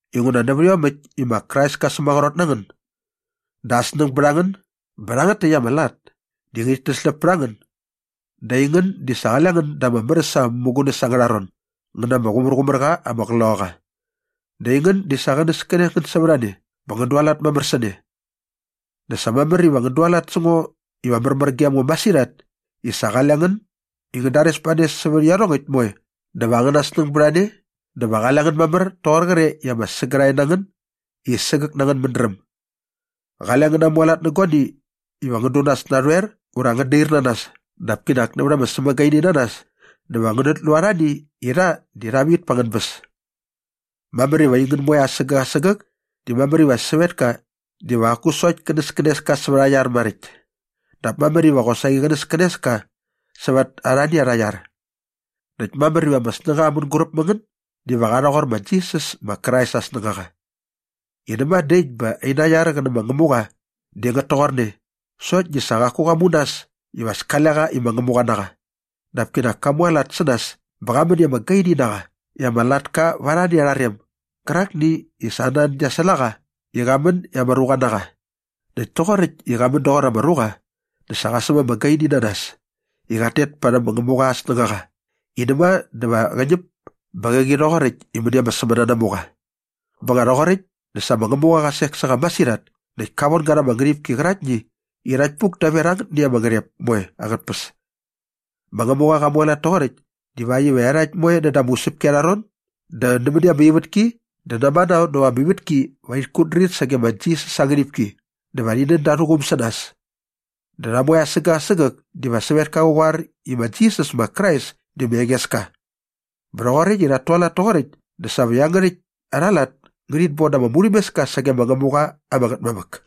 Inguna nävät iomäkt i ma Krais kä sämaqrot na ngän dä aa snäng bät a ngän bä rhangät täkt ama lat di ngärhit täsläp pät a ngän dä aingän di sa qale ngän da ama mär äs ama mämugunäs angärha ron ngän na ama Qloqaqa ama Qumärqumärqa dä aingän di sa qänäskänes ngän sävät a ne bä ngän dualat mamär sä ne dä sa mamär iva ngän dualat sä ngo iva märmär gem ngo masirhat i sa qale ngän i ngän dares ba ne sävät iarhongäkt moe dä va angäna snäng bät a ne dä va qale ngän mamär toqor qre i ama sägärhae na ngän i sägäk na angän mädräm. Qale ngän namualat nä guani iva ngän du nas narhoer ura ngän dair na nas dap kinak nävät ama sämagaininanas dä va ngänät lu arhani i rha di rha vit pa angän bäs. Mamär iva aingän moe asägäk asägäk di mamär iva sävetka diva qaku sokt känäskänes ka sävät aa iar maräkt dap mamär iva qosaqi qänäskänes ka sävät arhani arha iar. Näkt mamär iva ama snängaqa mänguräp mä ngän diva qa rhoqor ma Jisas ma Krais aa snängaqa i näma dä äkt bä aina iar qä nä ma Ngämuqa di ngät toqorne sokt di sa qaku qa mu nas iva as kale qa i ma Ngämuqa na qa dap kinak ka mualat sä nas bä qa män i ama gaini na qa i ama latka va arhani arha rem gärakni i sa aa nan gia säl a qa i qa män i ama ruqa na qa. Näkt toqoräkt i qa män doqor ama ruqa dä sa qa säm ama gaini na nas i qat tet parhäm ma Ngämuqa aa snängaqa i näma dä va qä ñäp bä qäqi rhoqoräkt i mäni ama sämänanamuqa. Bä nga rhoqoräkt dä sa ma Ngämuqa qa sek sä qa masirhat näkt ka von ga rha ama ngärhipki qäraktni i rhakt puk daver angätni ama ngärhep moe angät tpäs. Ma Ngämuqa qa mualat toqoräkt divakt iva iarhakt moe näda ama usäpki arha ron dä nämäni ama ivätki dä namanao näva ama ivätki va rhit kutdrir sage ma Jisas aa ngärhipki dä va rhi nän da arhä quum sä nas dä rha moe asägäk asägäk diva sävetka qä qoar i ma Jisas ma Krais di ma Engeska. Bä rhoqoräkt i rhat tualat toqoräkt dä sa va iangärhäkt arha lat ngärhit bon da ama murhämeska sage ma Ngämuqa ama Ngätmamäk.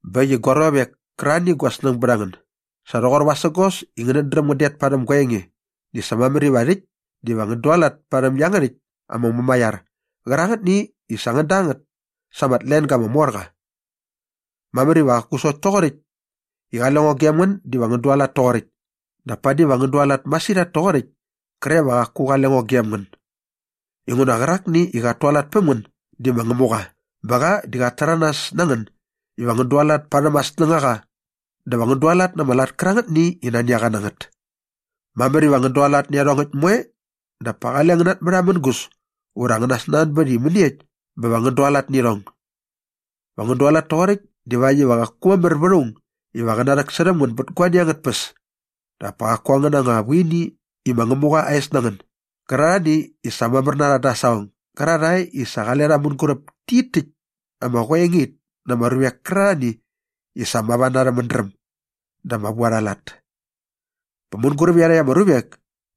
Bä äkt i gua ruavek kärarhani i gua snäng bät a ngän, sa rhoqor vasägos i ngänät dräm ngän det parhäm gua enge di sa mamär iva rhäkt diva ngän dualat parhäm iangärhäkt ama mumaiar qärangätni i sa ngän da ngät sa ama tlenga ama mor qa. Mamär iva qaku sokt toqoräkt i qale ngo gem ngän diva ngän dualat toqoräkt dap padi va ngän dualat masirhat toqoräkt kre va qaku qale ngo gem ngän inguna qärakni i qat tualat päm ngän di ma Ngämuqa bä qa di qat täranas na ngän iva ngän dualat parhäm aa snängaqa dä va ngän dualat na ama lat kärangätni i nani a qa na ngät. Mamär iva ngän dualat nä iarhongäkt moe dap pa qale ngän natmärhamängus ura ngän nasnanbät i mäniekt bä va ngän dualat nä irhong. Va ngän dualat toqoräkt divakt iva qaku mamär vät aung iva qä narhäksärhäm ngän bät guani angät tpäs dap pa qaku angäna anga vuini i ma Ngämuqa aa es na ngän gärarhani i sa mamär na rha dä aa saqong gärarhae i sa qale rha mänguräp tit täkt ama qoengait na ama ruvek kärarhani i sa mava na arhä mädräm dä ama vu arha lat. Bä mänguräp iarhakt ama ruvek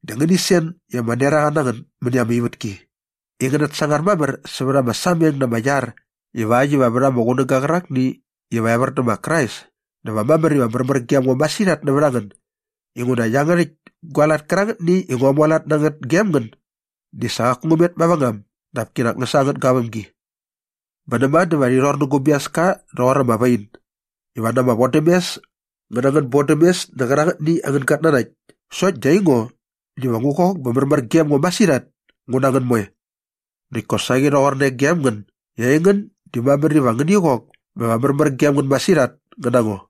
dä ngäni sen i ama neraqa na ngän mäni ama ivätki i ngänät sangar mamär sävät ama sameng na ama iar ivakt iva vät ama qunäga qärakni iva evär dä ma Krais dä va mamär iva märmär gem ngo masirhat nävät a ngän inguna iangärhäkt gua lat kärangät i ngua mualat na ngät gem ngän di sa qaku ngä met mavängam dap kinak ngä sa angät gavämgi. Bä näma dä va rhi rhor nä gu biaska rhoqor ama wain iva na ama vodämes ngä na angän bodämes nä qärangätni angän gatnanakt sokt di aingo diva ngu qok bä va märmär gem ngo masirhat ngu na ngän moe. Näkt kosaqi rhoqorne gem ngän i aingän di mamär iva ngäni qok bä va märmär gem ngän masirhat ngän na ngo.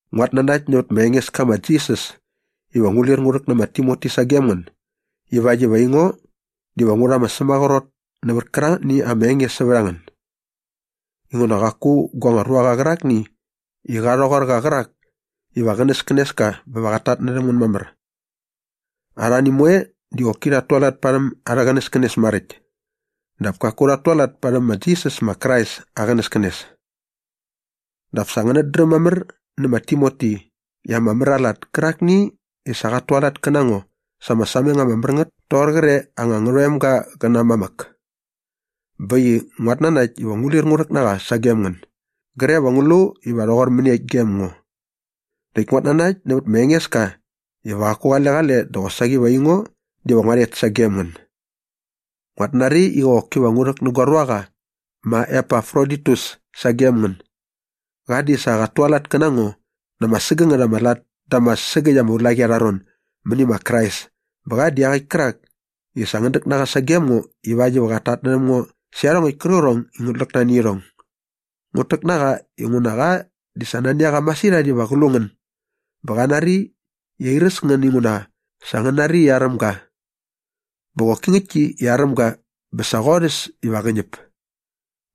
Nguat nanakt nävät ma Engeska ma Jisas iva ngu lir ngu rhäk nä ma Timoti sagem ngän ivakt iva aingo diva ngu rha ama sämaqrot nävät kärangätni ama enge sävät a ngän. Inguna qaku gua anga ruaqa qärakni i qa rhoqor qa qärak iva qänäskänes ka bä va qat tatnärhäm ngän mamär. Arhani moe di qoki rhat tualat parhäm arhä qänäskänes maräkt dap kaku rhat tualat parhäm ma Jisas ma Krais aa qänäskänes. Dap sa ngänät dräm mamär nä ma Timoti i ama mär aa lat kärakni i sa qat tualat kä na ngo sa ama sameng ama mär ngät toqor qre anga ngärhoemga qä na aa mamäk. Bä äkt i nguat nanakt iva ngu lir ngu rhäk na qa sagem ngän gre va ngu lu iva rhoqor mäniekt gem ngo. Näkt nguat nanakt nävät ma Engeska iva qaku qale qale dä qosaqi va aingo diva ngua rhet sagem ngän. Nguat nari iva qoki ngu rhäk na gua ruaqa ma Epafroditus sagem ngän. Qa di sa qat tualat kä na ngo na ama sägängät ama lat da ama sägäkt ama ulaqi arha ron mäni ma Krais bä qa di iaqäkt kärak i sa ngän däk na qa sagem ngo ivakt iva qat tatnärhäm ngo sä iarhongäkt kärqärhong i ngut läk nani irhong. Ngut täk na qa inguna qa di sa nani a qa masirhat iva qä lu ngän bä qa nari i airäs ngän inguna sa ngän nari i aräm ga. Bä qoki ngäktki i aräm ga bä sa qorhäs iva qä ñäp.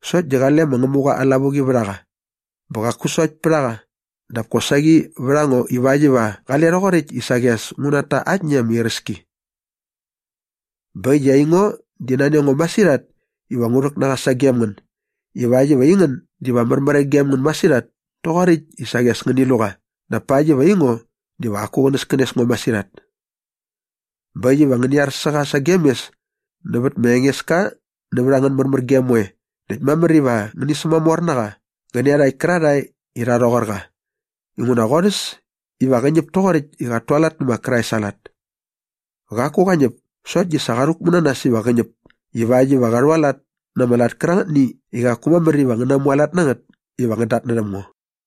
Sokt di qale ma Ngämuqa aa lavuqi vät a qa bä qaku sokt pät a qa dap kosaqi vät a ngo ivakt iva qale rhoqoräkt i saqi as ngut ta aktni ama iräski. Bä äkt i aingo di nani a ngo masirhat iva ngu rhäk na qa sagem ngän ivakt iva aingän diva märmär gem ngän masirhat toqoräkt i saqi as ngäni lu qa dap pakt iva aingo diva qaku qänäskänes ngo masirhat. Bä äkt iva ngäni ar sä qa sagem mes nävät ma Engeska nävät angän märmärgem moe näkt mamär iva ngäni sämamor na qa qä nä iarhakt kärarhae i rha rhoqor qa inguna qorhäs iva qä ñäp toqoräkt i qat tualat nä ma Krais aa lat. Qaku qa ñäp sokt di sa qa rhäkmu na nas iva qä ñäp ivakt iva qa rhualat na ama lat kärangätni i qaku mamär iva ngän namualat na ngät iva ngän datnärhäm ngo.